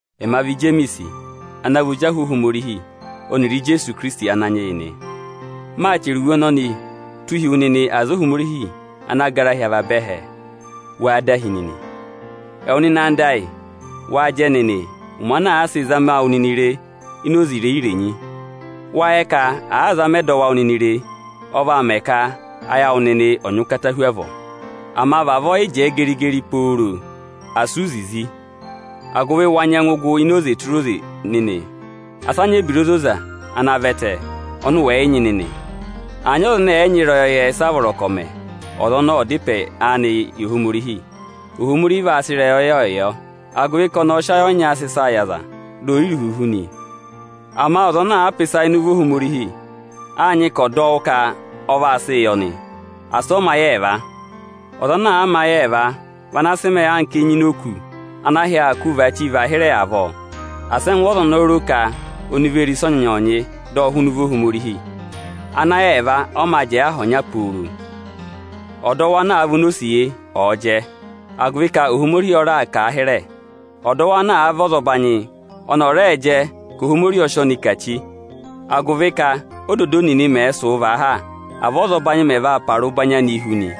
Ẹma vị Ijemiisi ana vị ozi ahụ Ohomorihi ọnịrị Ijeesu Ikirisiti Ananyị yị nị. Maa chẹrẹ iwe ọnọnịị tụ́ụ hi ẹwụ nịnị aza Ohomorihi ana gara hi avaba ẹhẹ. Wáá dahi nịnị? Ẹwụ nịnị ẹyịnyara amị, waa jẹ nịnị ụmẹ ana àa sị zama wụ nịnị re ini oze irenyi-irenyi. Wáa yẹ ka àa zama ẹdọwụ awụ nịnị re, ọ vaa mẹ ka ayị awụ nịnị ọ̀ nyị ụkata hu avọọ. Ama vavọọ yị jẹẹ geri-geri pooro nịnị, asị ụ zizi, agụvị wa nyẹngụ gụ ini oze tụra oze nịnị. Asị a nyị ebira ozoza ana vẹtẹ ọnị ụ wẹ̀ yị nyị nịnị. Ama àa nyị ọza awụ nịnị ẹnẹ ẹ̀ yị nyị ịrẹyọyẹ, ọza ọnọọ ọ̀ da ịpẹ anị yị Ohomorihi. Ohomorihi vaa sị ịrẹyọyẹ yọ, agụvị ka ọnị ọọ̄ sị ayị ọnyaa sị ịsaa yị ọza, dị ọ́ yị rị uhuhu nị. Ama ọza ọnọọ àa pa ịsa ịnị ụvọ Ohomorihi, áa nyị ka ọ̀ dọ wụ ka ọ vaa sịị yị ọnị; asị ọ mẹ ayị ẹẹva. Ọza ana àa mẹ ayị ẹẹva vị ana sị mẹẹ anka enyi ini òkū ana ahị aā kụ́ụ vaachii vaa hịrẹ avọọ. Asị ẹngụ ọza ọnọọ ro ka ọnị vee re ịsọnyị-ịsọnyịị dọ hụụnị ụvọ Ohomorihi. Anayẹẹva ọ mā jẹẹ aha ọnya pooro. Ọdọwụ ana vị onosiye ọ̀ọ jẹ agụvị ka Ohomorihi ọ raà kà a hịrẹ. Ọdọwụ ana vị ọzọbanyị, ọnị ọ̀ rẹẹ jẹ ka Ohomorihi ọ sị ọnị kà chi; agụvị ka ódodoo nịnị mẹẹ̄ sụ̀ụ vaa ha, avọọ ọzọbanyị mẹ̀ vaa para ụbanyị anịị hu nị.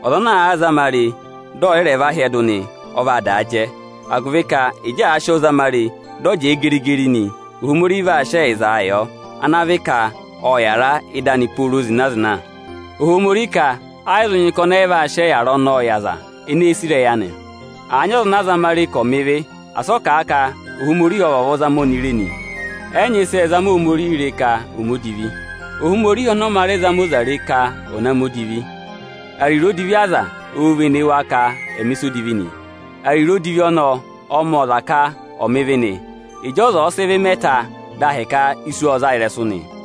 Ọza ana àa zama re dị ẹ̀ yị rẹ vaa hyẹdụ nị, ọ vaa daa jẹ; agụvị ka ịjị àa sị ọ zama re, dị ọ jẹẹ geri-geri nị, Ohomorihi vaa sị ẹyịza ọnị o wo oto anị yọ, ana vị ka ọ̀ yàra ịdị anị pooro zịna-zịna. Ohomorihi ka ẹ́ yị zụ nyị ka ọnị ọ́ yị vaa sị ọyịyara ọnọọ yị aza ene èe sì ịrẹyị anị. Àa nyị ọza ana a zama re ka ọ̀ mẹ ịvị, asị ọ kà a ka Ohomorihi ọ vavọọ zama ọnị re nị. Ẹ́ yị nyị ịsị ẹẹ̄ zama Ohomorihii re ka ọ̀ mẹ odivi. Ohomorihi ọnị ọ mā rẹ zama ọza re ka ọ̀ na mẹ odivi. Ariro odivi aza oō vene wa ka ẹ̀ na mẹ̀ ịsa odivi nị. Ariro odivi ọnọọ ọọ̄ mẹ̀ ọza ka ọ̀ mẹ ịvị nị. Ịjị ọza ọ̀ọ sị ịvị mẹ ta, dị ahịka isu ọ zaa ịrẹsụ nị.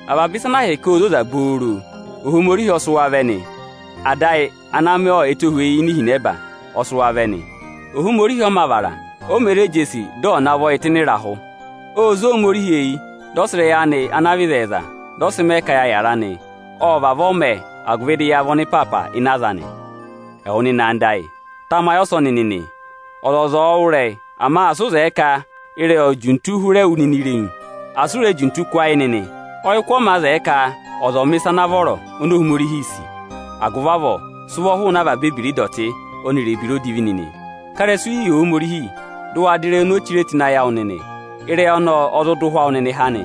Avaba ẹyịza ene zoza ana gụ vanaā hụụ ịdị Ohomorihii vẹ. Ịdị Ada ayị ana mẹ ẹtohweyi hi ini ihinẹba ẹẹ̄ hụrẹẹ vẹ nị. Ohomorihi ọ mā vara, o mē re jesi dị ọ̀ navọ yị tụ́ ịnị ịrahụ. Ô zé Ohomorihi eyi, dị ọ sị ịrẹyị anị ana vị ịzẹyịza, dị ọ sị mẹ ka ya yàra nị; ộ vavọọ mẹ, agụvị dị ya vị ọnịpaapa ịnị aza anị. Ẹwụ nịnị ẹyịnyara amị oni mi sì, tamayị ọsọnị nịnị: Ọzọza ọ̀ọ wụ́ ịrẹyị, ama asị ụ zẹẹ ka ịrẹyị òo juntuu hụrẹ wụ nịnị irenu. Asị u re juntu kụ́ ayị nịnị. Ọyịkụ ọ mā zẹẹ ka ọza ọ̀ mẹ̀ ịsa ana vọrọ oni Ohomorihi sì. Agụvị avọọ, sị ụvọ hụụnị avaba ebira ịdọtị ọnịrị ebira odivi nịnị! Ká ịrẹsụ hi yị Ohomorihi, dị ụ wa dọ ịrẹyị oni o chire tụ́ ịnị ayị awụ nịnị. Ịrẹyị ọnọọ ọ zụ dọ ụhwẹ awụ nịnị há nị.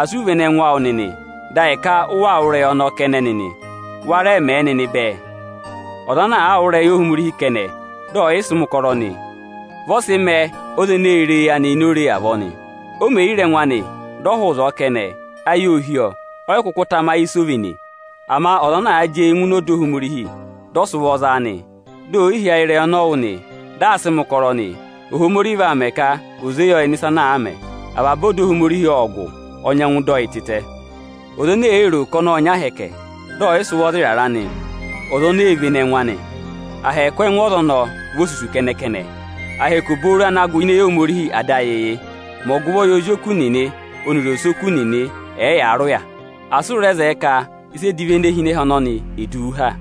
Asị u vene ẹngụ awụ nịnị, dị ahịka ụ waa wụ́ ịrẹyị ọnọọ kẹnẹ nịnị nị; wa rẹẹ mẹ̀ ẹ nịnị bẹẹ. Ọza ana àa wụ́ ịrẹyị Ohomorihi kẹnẹ, dị ọ̀ yị sị mẹ̀ ụkọrọ nị, vị ọ sị mẹẹ ọza ene ee re ẹngụ anị ini ore avọọ nị; o me yi re ẹngụ anị, dị ọ hụụ ịzọọ kẹnẹ, ayị oo hí ọ, ọ́ yị kụkụ tamayị ịsị o véné. Ama ọza ana àa jị eyi ngụ ọda Ohomorihi, dị ọ sị ụvọ zaa, di ò yi hí ayị ịrẹyị ọnị ọ wụ́, dị aa sịị mẹ̀ ụkọrọ nị, Ohomorihi vaa mẹ ka ò zé yọ ịnị ịsa ana àa mẹ. Avaba ọda Ohomorihi ọ́ọ gụ, ọ nyẹngụ dọ yị tịtẹ. Ọza ene èe ro ka ọnị ọ́ọ nyị ahẹkẹ, dị ọ̀ yị sị ụvọ za ịrarẹ anị nị, ọza ọnọọ ee vene ẹngụ anị. Ahẹkẹ ẹngụ ọza ọnọọ vị ahẹkẹ osusu kẹnẹ-kẹnẹ. Ahẹkẹ obooro ana gụ ini eyi Ohomorihi Ada ayị yị: Mẹ ọgụvọ yị ozi oku nịnị ọnịrị osoku nịnị, ẹ̀ẹ yaa rị ụya; asị ụ rẹ zẹẹ ka ịsa edivi ene hi ịnị ẹhẹ ọnọnị è du wu ha.